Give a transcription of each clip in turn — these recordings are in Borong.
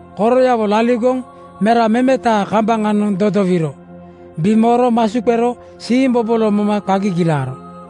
Koroyawo laligoŋ mera memetaa kambaŋanoŋ dodowiro bimooro masu qero siimbobolo moma qa gigilaaro.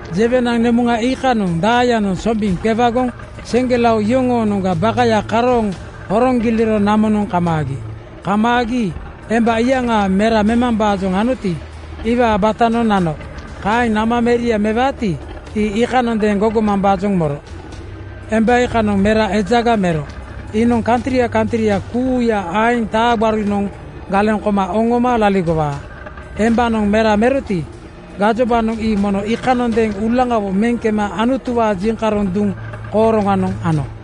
Jewenaŋ nemuŋa iikanoŋ daayanoŋ sombiŋ qewagoŋ seŋgelao iyoŋoonoŋga bakaya karooŋ horoŋ giliro namonoŋ kamaagi. Kamaagi emba iyaŋa mera memambaajoŋ anoti, iwaa batanoŋ nano. Kaeŋ nama meria mewaati, ii iikanondeeŋ gogomambaajoŋ moro. Emba iikanoŋ mera ejaga mero. Iinoŋ kantria kantria kuuya aeŋ taa gbarunoŋ galeŋ koma oŋoma laligowaa. Embanoŋ mera meroti, gajobanoŋ ii mono iikanondeeŋ uulaŋawo meŋ kema Anutuwaa jiŋkaroŋ duŋ kooroŋanoŋ ano.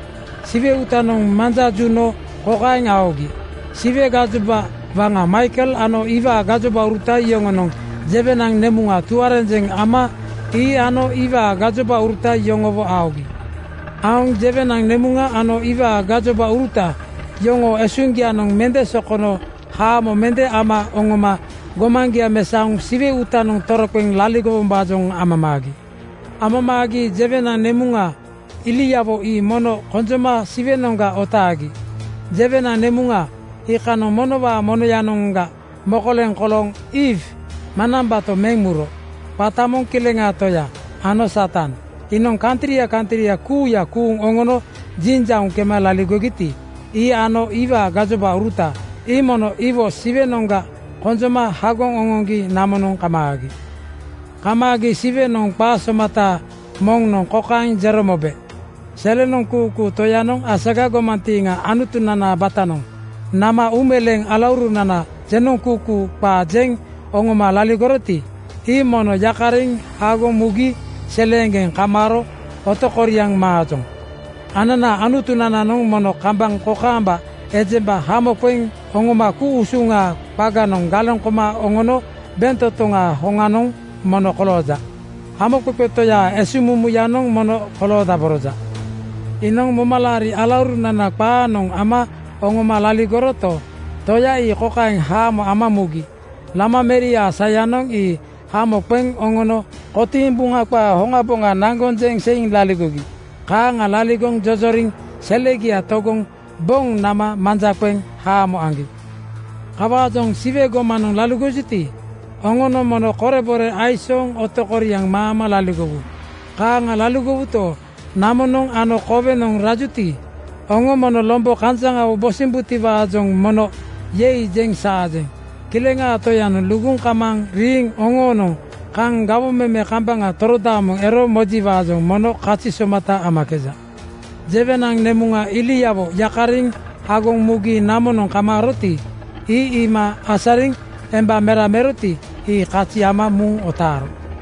Siwe uutanoŋ manja juno kokaeŋ aogi: Siwe gajoba waŋa Maikel ano iwaa gajobauruta yoŋonoŋ jewenaŋ nemuŋa tuarenjeŋ ama ii ano iwaa gajobauruta yoŋowo aogi. Aoŋ jewenaŋ nemuŋa ano iwaa gajobauruta yoŋoo esuŋgianoŋ mende sokono haamo mende ama oŋoma gomaŋgia mesaoŋ Siwe uutanoŋ toroqeŋ laligowombaajoŋ amamaagi. Amamaagi jewenaŋ nemuŋa iliawo ii mono konjoma Siwenoŋga otaagi. Jewenaŋ nemuŋa iikanoŋ monowaa monoyanoŋga mokoleŋ kolooŋ Iiw (Eewa) manambato meŋ muro. Qata moŋ Kileŋaa Toya ano Satan. Iinoŋ kantria kantria kuuya kuuŋ oŋono jinjauŋ kema laligogiti, ii ano iwaa gajobauruta ii mono iwo Siwenoŋga konjoma hagoŋ oŋoŋgi namonoŋ kamaagi. Kamaagi Siwenoŋ qa somata moŋnoŋ kokaeŋ jero mobe, “Selenoŋ kuukuu Toyanoŋ asaga gomantiiŋa Anutunanaa batanoŋ nama uumeleeŋ alaurunana jenoŋkuukuu qaa jeŋ oŋoma laligoroti, ii mono yakariŋ hagoŋ mugi seleeŋgeŋ kamaaro otokoriaŋ maajoŋ. Ananaa Anutunananoŋ mono kambaŋ kokaamba ejemba hamo qeŋ oŋoma ku-usuŋaa qaganoŋ galeŋ koma oŋono bentotoŋaa hoŋanoŋ mono kolooja. Hamoqeqe Toyaa esuŋmumuyanoŋ mono koloodaboroja. Iinoŋ momalaari alaurunana qaanoŋ ama oŋoma laligoroto, Toya ii kokaeŋ haamo ama mugi: Lama meriaa sayanoŋ ii hamo qeŋ oŋono kotiiŋ Buŋa qaa hoŋaboŋa naŋgoŋ jeŋ seiŋ laligogi. Kaaŋa laligoŋ jojoriŋ selegia togoŋ boŋ nama manja qeŋ haamo aŋgi. “Kawaajoŋ Siwe gomanoŋ laligojuti, oŋonoŋ mono korebore aisooŋ otokoriaŋ maama laligowu. Kaaŋa laligowuto, namonoŋ ano kowenoŋ laligojuti, oŋo mono lombo kanjaŋawo bosimbutiwaajoŋ mono ‘Yei!’ jeŋ saajeŋ. Kileŋaa Toyanoŋ luguŋ kamaaŋ riiŋ oŋoonoŋ kaŋ gawoŋ meme kambaŋa torodaamoŋ ero mojiwaajoŋ mono kazi somata amakeja.” Jewenaŋ nemuŋa iliawo yakariŋ hagoŋ mugi namonoŋ kamaaroti, ii iima asariŋ emba mera meroti, ii kazi ama muŋ otaaro.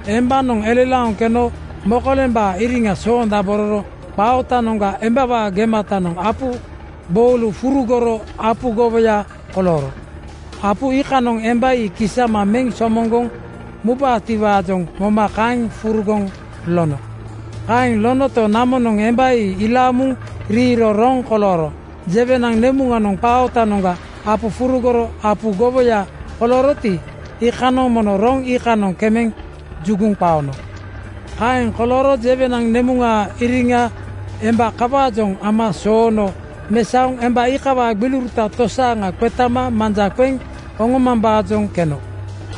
Embanoŋ elelaoŋ keno mokolembaa iriŋa soondabororo qaa ootanoŋga embawaa gematanoŋ apu gboulu furugoro apu gowoya kolooro. Apu iikanoŋ emba ii kisama meŋ somoŋgoŋ mubaatiwaajoŋ moma kaeŋ furugoŋ lono. Kaeŋ lonoto, namonoŋ emba ii ilaaŋ muŋ riiro roŋ kolooro. Jewenaŋ nemuŋanoŋ qaa ootanoŋga apu furugoro apu gowoya kolooroti, iikanoŋ mono roŋ iikanoŋ kemeŋ juguŋ qaono. Kaeŋ kolooro jewenaŋ nemuŋaa iriŋa emba kawaajoŋ ama soono mesaoŋ emba iikawaa gbiliuruta tosaaŋa qetama manja qeŋ oŋomambaajoŋ keno.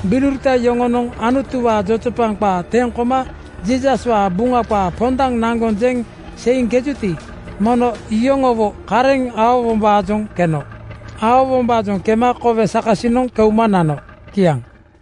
Gbiliuruta yoŋonoŋ Anutuwaa jojopaŋ qaa teŋ koma Jiisaswaa Buŋa qaa pondaŋ naŋgoŋ jeŋ seiŋkejuti, mono iyoŋowo kareŋ aowombaajoŋ keno. Aowombaajoŋ kema kowe sakasiŋanoŋ keuma nano. Kiaŋ.